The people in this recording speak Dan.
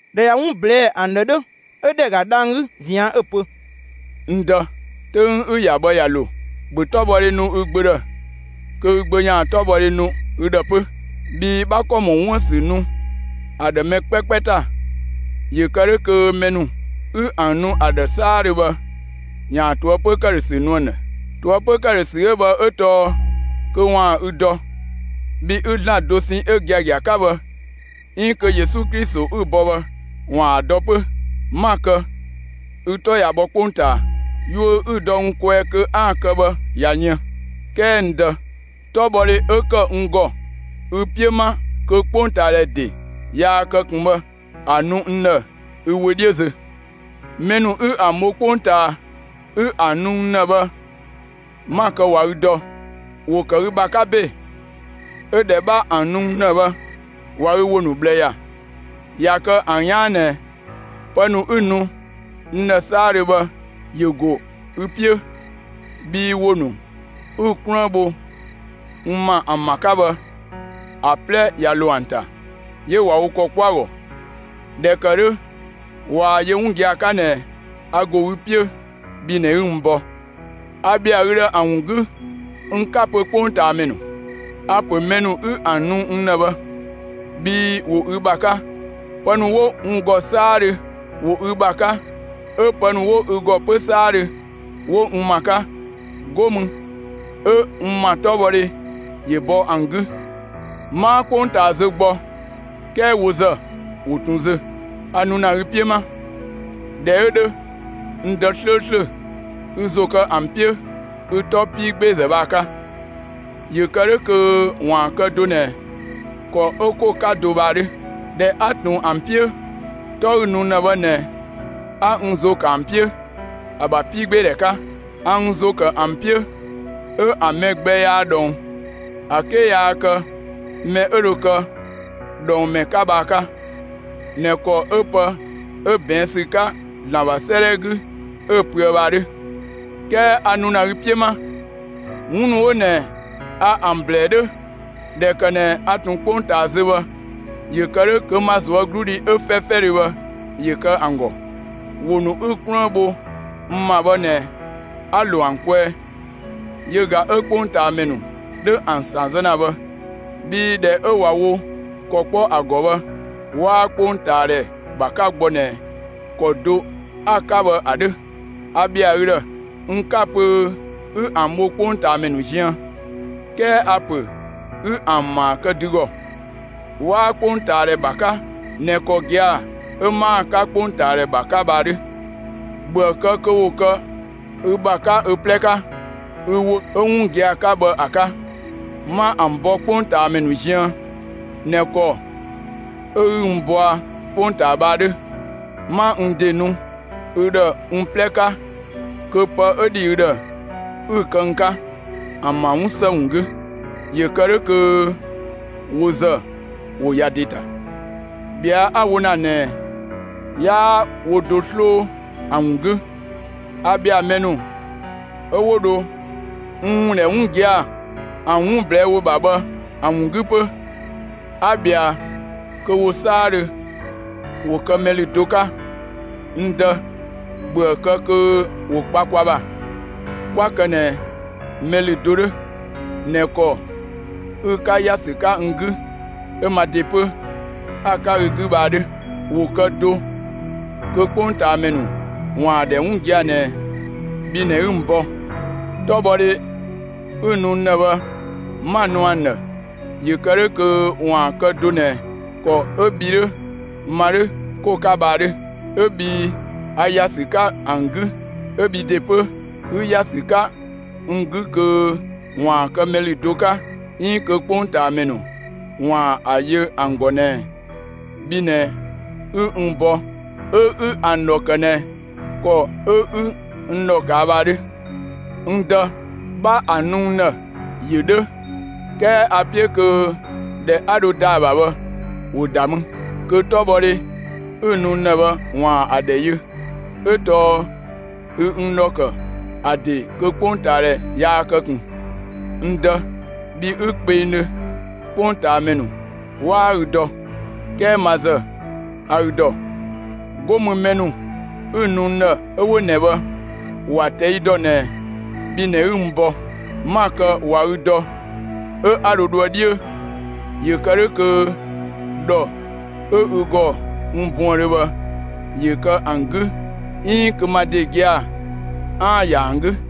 ꞊Dhɛ ꞊ya 'wun ꞊blɛɛ'‑ ‑an ‑dhë 'dhö, 'ö ‑dhɛ ‑ga dhang‑ 'gü ꞊zian', 'ö‑ pö: «N Dë, 'töng 'ü‑ ‑ya bhë ꞊ya ‑lo. ‑Bhö 'tɔbhɔdhe nu ü Gbö ‑dhë kö ü Gbö ‑yaan 'tɔbhɔdhe nu ü ‑dhë 'pö. Bhii 'bha ‑kɔ ‑mɔ 'wuën‑ ‑sü nu ‑a ‑dhë mɛ 'kpɛkpɛ ‑ta, ‑yö kë 'dhö kö mɛ ‑nu 'ü ‑an nu ‑a ‑dhë 'saadhö bhë ‑yaan ꞊toëpö ‑këdhösü nu ‑an ‑dhë. ꞊Toëpö ‑këdhösü 'ö bhë 'ö tɔɔ kö ‑waan ü dɔ, bhi 'ü ‑Zlan dosɛn 'ö giagia 'ka bhë 'iin kö Yesu Klito 'ü‑ bɔ bhë ‑waan ‑a dɔ 'pö. 'Ma‑ kë, ü 'tɔ ꞊ya bhɔ 'kpongtaa. Yuö 'ü‑ dɔ n kwɛɛ kö 'aan‑ kë bhë ꞊ya yën. 'Kɛɛ n Dë, 'tɔbhɔdhe 'ö ‑kë n ‑gɔ ü 'piö 'ma kö 'kpongtaadhɛ ‑de yaa kë ꞊kun bhë, ‑a nu n ‑dhë ü wö 'dhiö zö. Mɛ ‑nu 'ü ‑an bho 'kpongtaa 'ü ‑an nu n ‑dhë bhë, 'ma‑ kë ꞊wa ü dɔ. ‑Wo ‑kë ü ‑bha 'ka ‑be; 'ö ꞊dhɛ 'bha ‑an nu n ‑dhë bhë, ꞊wa ü ‑wo ‑nu ꞊bhlë ‑ya. ꞊Ya kë ‑an 'yaan ꞊nɛ pë ‑nu 'ü‑ nu n ‑dhë 'saadhö bhë ‑yö ‑go ü 'piö, bhii ‑wo ‑nu 'ü‑ 'kluën bho n ‑ma ‑an ‑bha 'ka bhë, ‑a 'plɛ ꞊ya ‑lo ‑an ‑ta; 'yö ꞊wa wo ‑kɔ 'kpɔ ‑a ‑gɔ. ꞊Dhɛ ‑kë 'dhö ꞊waa‑ yö 'wun gia‑ 'ka ꞊nɛ a ‑go ü 'piö, bhi ꞊nɛ 'ü n bɔ. A ‑bhɛa ü ‑dhë ‑an ‑wun 'gü. N 'ka‑ pö 'kpongtaamɛ ‑nu. A‑ ‑pö mɛ ‑nu 'ü ‑an nu n ‑dhë bhë, bhii ‑wo ü ‑bha 'ka. Pë ‑nu 'wo n ‑gɔ 'saadhö, ‑wo ü ‑bha 'ka; 'ö pë ‑nu 'wo ü ‑gɔ 'pö 'saadhö, 'wo n ‑ma 'ka. 'Go mü 'ö n ‑ma 'tɔbhɔdhe ‑yö bɔ ‑an 'gü. 'Maa 'kpongtaa zö gbɔ, 'kɛɛ wo ‑zë, ‑wo ꞊tun zö. A nu ‑na ü 'piö 'ma. ꞊Dhɛ 'ö 'dhö, n Dë 'slööslö, ü ‑zo kë ‑an 'piö, ü 'tɔ 'piigbeezë bhë ‑a 'ka, ‑yö kë 'dhö kö ‑waan kë do ꞊nɛ ‑kɔ 'ö 'ko‑ 'ka do bhë ‑a 'dhö. ꞊Dhɛ 'a ꞊tun ‑an 'piö, 'tɔ 'ü‑ nu n ‑dhë bhë ꞊nɛ 'a n ‑zo ‑kë ‑an 'piö ‑a ‑bha 'piigbeedhɛ 'ka. A n ‑zo ‑kë ‑an 'piö, 'ö ‑an mɛ gbɛ yaa ꞊dhɔng, ‑a 'ke yaa kë mɛ 'ö dho kë dhɔng ‑mɛ 'ka bhë ‑a 'ka, ꞊nɛ ‑kɔ 'ö pë 'ö ꞊bɛɛn' ‑sü 'ka ‑Zlan ‑bha 'sëëdhɛ 'gü 'ö‑ pöë bhë ‑a 'dhö. 'Kɛɛ a nu ‑na ü 'piö 'ma. 'Wun ‑nu 'wo ꞊nɛ a ‑an ‑blɛɛ 'dhö ꞊dhɛ ‑kë ꞊nɛ a ꞊tun 'kpongtaa zö bhë, ‑yö kë 'dhö kö ma ꞊zuögludhi 'ö 'fɛfɛdhö bhë ‑yö kë ‑an ‑gɔ. ‑Wo ‑nu 'ü‑ 'kluën bho n ‑ma bhë ꞊nɛ 'a‑ ‑lo ‑an kwɛɛ. Yö ꞊ga 'ö 'kpongtaamɛ ‑nu 'dhö ‑an ‑san zë ‑na bhë, bhii ‑dhɛ 'ö ꞊wa wo ‑kɔ 'kpɔ ‑a ‑gɔ bhë, 'waa 'kpongtaadhɛ ‑bha 'ka gbɔ ꞊nɛ ‑kɔ do 'a‑ 'ka bhë ‑a 'dhö. A ‑bhɛa ü ‑dhë. N 'ka‑ pö 'ü ‑an ‑bho 'kpongtaamɛ ‑nu ziën, 'kɛɛ a‑ ‑pö 'ü ‑an ‑maa kë dü ‑gɔ. 'Waa 'kpongtaadhɛ ‑bha 'ka ꞊nɛ ‑kɔ gia‑ 'ö 'maa‑ 'ka 'kpongtaadhɛ ‑bha 'ka bhë ‑a 'dhö. ‑Bhöë kë kö ‑wo kë ü ‑bha 'ka ö 'plɛ 'ka, ü ‑wo 'ö 'wun gia‑ 'ka bhë ‑a 'ka. 'Ma ‑an bɔ 'kpongtaamɛ ‑nu ziën ꞊nɛ ‑kɔ 'ö 'ü n bɔa 'kpongtaa bhë ‑a 'dhö. 'Ma n ‑de nu ü ‑dhë n 'plɛ 'ka (kö pë 'ö ‑dhi ü ‑dhë 'ü‑ kë n 'ka), ‑an ‑bha 'wun ‑së ‑wun 'gü, ‑yö kë 'dhö kö wo ‑zë ‑wo ‑ya ‑de ‑ta. ꞊Bhɛa' 'a‑ wo ‑na ꞊nɛɛ, 'yaa wo do 'sloo ‑an ‑wun 'gü; a ‑bhɛa mɛ ‑nu 'ö 'wo dho n ‑wun ‑dhɛ 'wun gia‑, ‑an 'wun ꞊blɛɛ' ‑wo ‑bha bhë ‑an ‑wun 'gü 'pö. A ꞊bhɛa kö wo 'saadhö ‑wo kë mɛ ‑lü do 'ka. N Dë, ‑bhöë kë kö ‑wo kpa kwa ‑bha, 'kwa kë ꞊nɛ mɛ ‑lü do 'dhö ꞊nɛ ‑kɔ 'ü‑ 'ka ‑ya ‑sü 'ka n 'gü, 'ö ma ‑de 'pö 'a‑ 'ka ü 'gü bhë ‑a 'dhö. ‑Wo kë do kö 'kpongtaamɛ ‑nu ‑waan ‑a ‑dhɛ 'wun gia‑ ꞊nɛ bhi ꞊nɛ 'ü n bɔ. 'Tɔbhɔdhe 'ü‑ nu n ‑dhë bhë, 'ma‑ nu ‑an ‑dhë ‑yö kë 'dhö kö ‑waan kë do ꞊nɛ ‑kɔ 'ö bhi 'dhö, ma 'dhö, 'ko‑ 'ka bhë ‑a 'dhö. 'Ö bhii a ‑ya ‑sü 'ka ‑an 'gü, 'ö bhi ‑de 'pö, ü ‑ya ‑sü 'ka n 'gü kö ‑waan kë mɛ ‑lü do 'ka 'iin kö 'kpongtaamɛ ‑nu ‑waan ‑a yö ‑an ‑gɔ ꞊nɛ bhi ꞊nɛ 'ü n bɔ 'ö 'ü ‑an ‑dhɔ ‑kë ꞊nɛ ‑kɔ 'ö 'ü n ‑dhɔ ꞊kaa' bhë ‑a 'dhö. N Dë, 'bha ‑an nu n ‑dhë. ‑Yö 'dhö, 'kɛɛ a‑ 'piö kö ‑dhɛ 'a dho ‑da ‑a ‑bha bhë, ‑wo ‑da mü, kö 'tɔbhɔdhe 'ü‑ nu n ‑dhë bhë ‑waan ‑a ‑dhɛ yö, 'ö tɔɔ ü n ‑dhɔ ‑kë ‑a ‑de kö 'kpongtaadhɛ yaa kë ꞊kun. N Dë, bhi 'ü kpengdhö, 'kpongtaamɛ ‑nu 'waa ü dɔ; 'kɛɛ ma ‑zë, a ü ‑dɔ. 'Go mü mɛ ‑nu 'ü‑ nu n ‑dhë, 'ö 'wo ꞊nɛ bhë, ‑wa ꞊tɛi' ‑dɔ ꞊nɛ bhi ꞊nɛ 'ü n bɔ. 'Ma‑ kë ꞊wa ü dɔ 'ö 'a dho dhoë 'dhiö, ‑yö kë 'dhö kö ‑dhɔ 'ö ü ‑gɔ n buëndhö bhë, ‑yö kë ‑an 'gü 'iin kö ma ‑de gia‑ 'aan‑ ‑ya ‑an 'gü.»